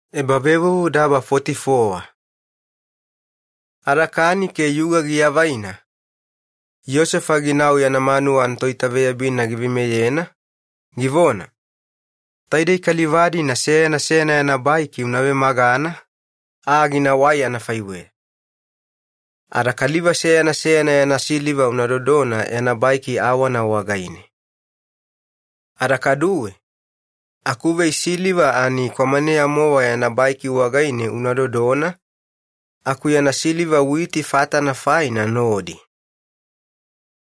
Vei siliva baiki wagaine. Ada kani ke yuga giavaina, Yosefa ginau yana manuwa anatoitaveyabina giveimeyena, givona, “Taidei kaliva-dina seyana seyana yana baiki una vemagana, aa ginawai anafaiweya. Ada kaliva seyana seyana yana siliva una dodona yana baiki awana wagaine. Ada kaduwe akuvei siliva ani kwamaneya-mowa yana baiki wagaine una dodona, aku yana siliva witi fatana faina nodi.”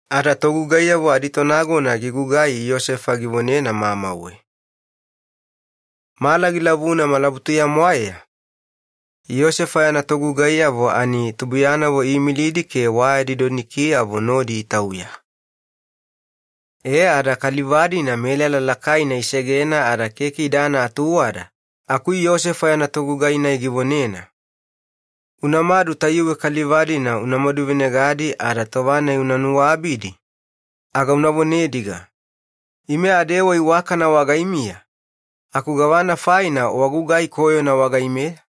Ada togugaiyavo aditonagona gigugai Yosefa givonena mamauwe. Mala gilavuna malabutuya-mwaeya Yosefa yana togugaiyavo ani tubuiyanavo iimilidi ke wayadi donikiyavo nodi itauya. E ada kaliva-dina melala lakaina isegena, ada keke idana atuwada aku Yosefa yana togugai-nai givonena, “Unamadu tayuwe kaliva-dina unamadu venegadi, ada tova-nai una nuabidi aga una vonediga, ‘Ime adewa iwakana wagaimiya aku gavana faina wagugai koyona wagaimeya?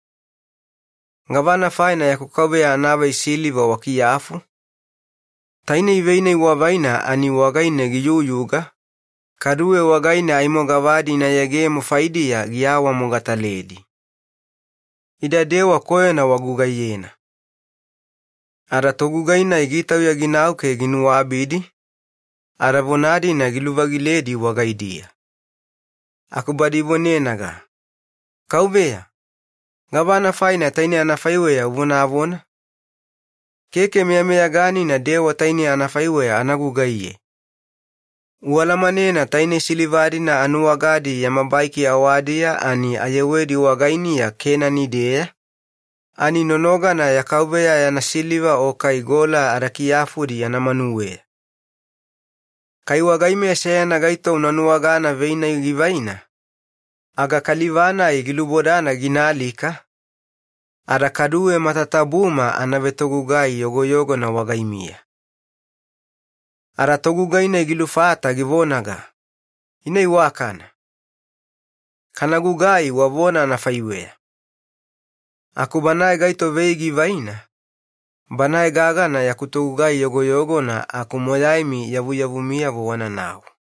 Gavana faina yaku kauveya anavei siliva wakiyafu? Tainei vei-nai wavaina ani wagaine giyuyuga, kaduwe wagaine aimo gavadi ina yegemo faidiya giawamogataledi. Ida dewa koyona wagugaiyena.’” Ada togugai-nai gitauya ginau ke ginuabidi, ada vona-dina giluvagiledi wagaidiya, aku ivonenaga, “Kauveya, gavana faina tainei anafaiweya uvonavona? Keke meyameyaganina dewa tainei anafaiweya anagugaiye! Ualamanena tainei siliva-dina anuwagadi yama baiki awadiya ani ayewedi wagainiya Kenani-deya, ani nonogana ya kauveya yana siliva o kai gola adakiyafudi yana manuweya. Kai wagaimeya seyana gaito una nuwagana vei-nai givaina, aga kaliva-nai gilubodana ginaalika, ada kaduwe matatabuma ana vetogugai yogoyogona wagaimiya.” Ada togugai-nai gilufata givonaga, “Ina iwakana. Kanagugai wavona anafaiweya aku banae gaito vei givaina, banae gagana yaku togugai yogoyogona, aku matatabumi yavuyavumiyavo wananau.”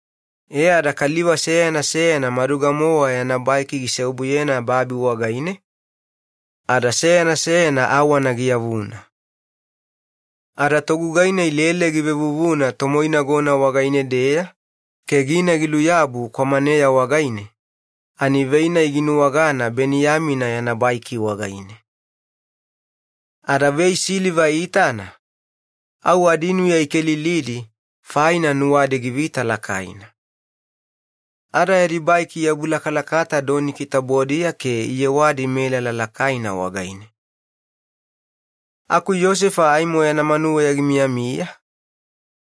E ada kaliva seyana seyana maduga-mowa yana baiki giseobuyena babi wagaine ada seyana seyana awana giyavuna. Ada togugai-nai lele givevuvuna tomoinagona wagaine-deya ke gina giluyabu kwamaneya wagaine ani vei-nai ginuwagana Beniyamina yana baiki wagaine. Ada vei siliva iitana, au adinuya ikelilidi faina nuwadi givita lakaina. Ada yadi baiki iabulakalakata doniki tabodiya ke iyewadi melala lakaina wagaine. Aku Yosefa aimo yana manuweya gimiyamiya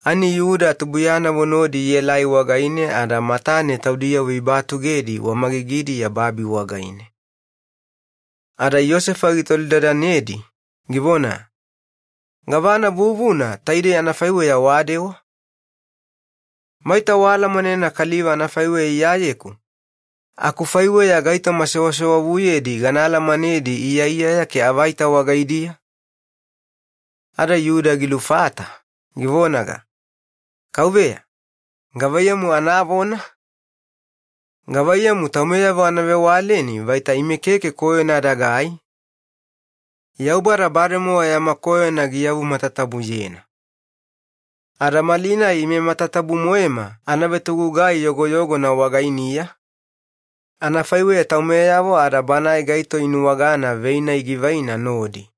ani Yuda tubuiyanavo nodi ielai wagaine, ada matane taudiyavo ibatugedi wamagigidiya babi wagaine. Ada Yosefa gitolidadanedi, givona, “Gavana vuvuna taidei anafaiweya wadewa? Maita waalamanena kaliva anafaiweya iyayeku, akufaiweya gaitoma sewasewavuyedi gana alamanedi, iyaiyaya ke avaita wagaidiya?” Ada Yuda gilufata, givonaga, “Kauveya, gavana meyameyaganina anavona? Gavaiyamu taumeyavo ana vewaleni vaita ime keke koyona adagai? Yaubada bademowa yama koyona giyavumatatabuyena. Ada malinai ime matatabu-moema ana vetogugai yogoyogona wagainiya, anafaiweya taumeyavo ada banae gaito inuwagana vei-nai givaina nodi.”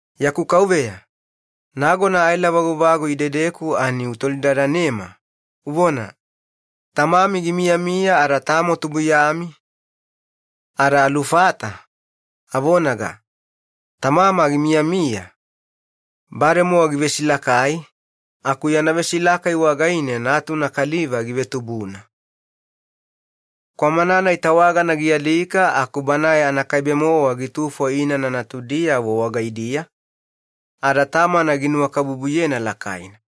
Yaku kauveya, nagona aela vaguvagu idedeku ani utolidadanema, uvona, ‘Tamami gimiyamiya ada tamo tubuiyami?’ Ada alufata, avonaga, ‘Tamama gimiyamiya, bademowa givesilakai, aku yana vesilakai wagaine natuna kaliva givetubuna. Kwamana-nai tawagana gialika aku banae anakaibe-mowa gitufo inana natudiyavo wagaidiya, ada tamana ginunuwakabubuyena lakaina.’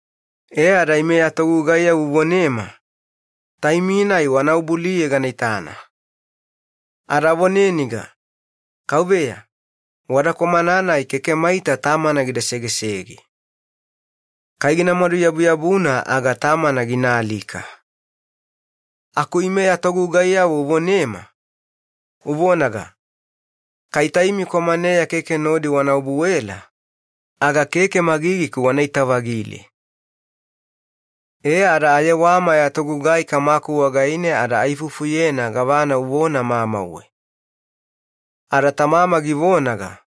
E ada ime ya togugaiyavo uvonema, ‘Taimi-nai wanaobu-aliye gana itana.’ Ada avoneniga, ‘Kauveya, wada kwamana-nai keke maita tamana gida segesege. Kai gina-maduyabuyabuna aga tamana ginaalika.’ Aku ime ya togugaiyavo uvonema, uvonaga, ‘Kai taimi kwamaneya keke nodi wana obuela, aga keke magigiku wanaita-vagile.’ “E ada ayewama ya togugai kamaku wagaine ada aifufuyena gavana uvona mamauwe. Ada tamama givonaga,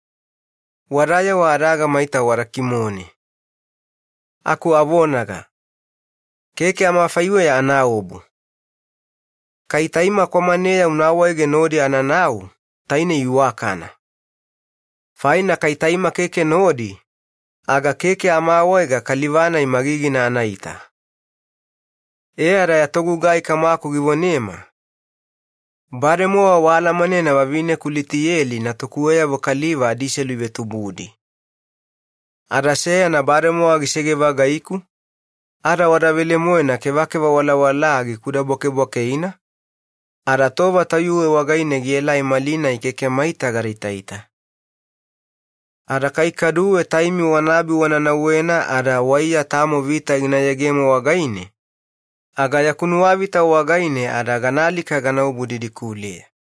‘Wadayewa adaga maita wada kimone,’ aku avonaga, ‘Keke amafaiweya anaobu. Kai taima kwamaneya una awaege nodi ananau, tainei iwakana. Faina kaliva-nai aimo keke meyameyaganina magigina anaita kai taima keke nodi.’ “E ada ya togugai kamaku givonema, ‘Bademowa waalamanena vavineku Litiyeli natukuweyavo kaliva adiselu ivetubudi. Ada seyana bademowa gisege-vagaiku, ada wada velemoena kevakeva walawalaa ikudabwakebwakeina, ada tova tayuwe wagaine gielai malinai keke maita gadaitaita. Ada kai kaduwe taimi wanaabi wana nauwena ada waiya tamo vita gina yegemo wagaine, aga yaku nuwavita wagaine ada ganaalika ganaobu didikuleya.’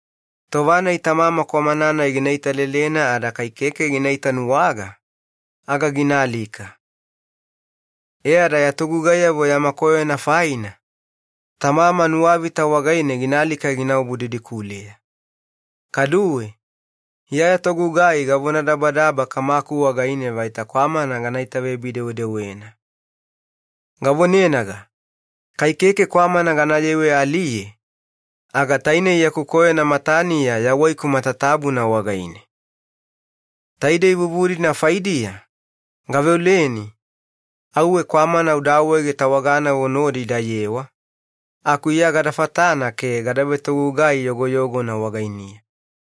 Tova-nai tamama kwamana-nai gina italelena ada kai keke gina itanuwaga aga ginaalika. E ada ya togugaiyavo yama koyona faina, tamama nuwavita wagaine ginaalika ginaobu didikuleya. Kaduwe, iya ya togugai gavonadabadaba kamaku wagaine vaita kwamana gana itaveyabi-dewedewena. Gavonenaga, ‘Kai keke kwamana ganayewe-aliye, aga tainei yaku koyona mataniya yawaiku matatabuna wagaine.’ “Taidei vuvu-dina faidiya, gaveoleni, auwe kwamana uda awaege tawaganavo nodi idayewa, aku iya gada fatana ke gada vetogugai yogoyogona wagainiya.